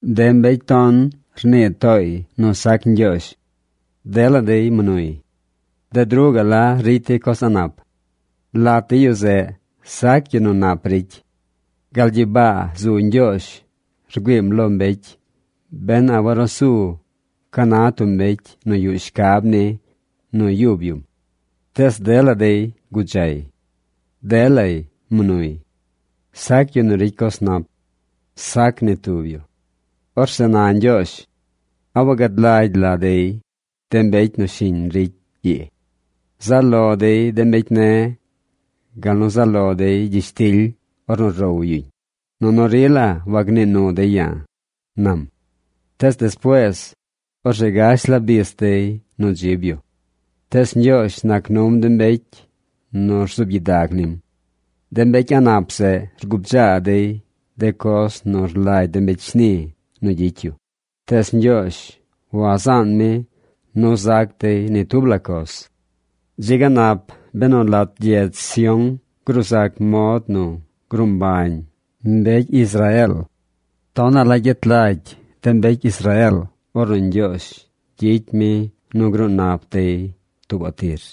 De mbecy ton rnii tooy nu sac Ñgyoozh. Dela dey mnuy. Bded ruꞌ gaꞌ la ricy dey coz a̱ꞌ nap. Lat de yu zeꞌ sac yu nu nap ricy. Gal gyibaa zu Ñgyoozh rgüiim lo mbecy ben a warusu ca na tub mbecy nu yuꞌ shcab ni nu yub yum. Tees dela dey gudzay. Delay mnuy. Sac yu nu ricy coz nap. Sac ni tub yu. Orzeꞌ na Ñgyoozh: “¿A wagad lagy la dey, de mbecy nu shiñ ricy ii? Zaꞌ lo dey de mbecy ne̱ gal nu zaꞌ lo dey gyishtily ornu row yuñ, nunu rila wagnii nu dey ya̱”, nam. Tees despuees, orzeꞌ gash la bis dey nu dzib yu. Tees Ñgyoozh nac num de mbecy nu rzuub gyidag nim. De mbecy a̱ꞌ nap zeꞌ rgubdzaa dey de coz nu rlagy de mbecy shni nu gyicy yu, tees Ñgyoozh wazaan mi nu zac dey ni tub la coz. ¡Dzi ga nap benu lat gyedz Sión gruu zac mod nu gruu mbañ mbecy Israeel! Tonaꞌ la gyet lagy de mbecy Israeel ornu Ñgyoozh gyicy mi nu gruu nap dey tuubaꞌ tir.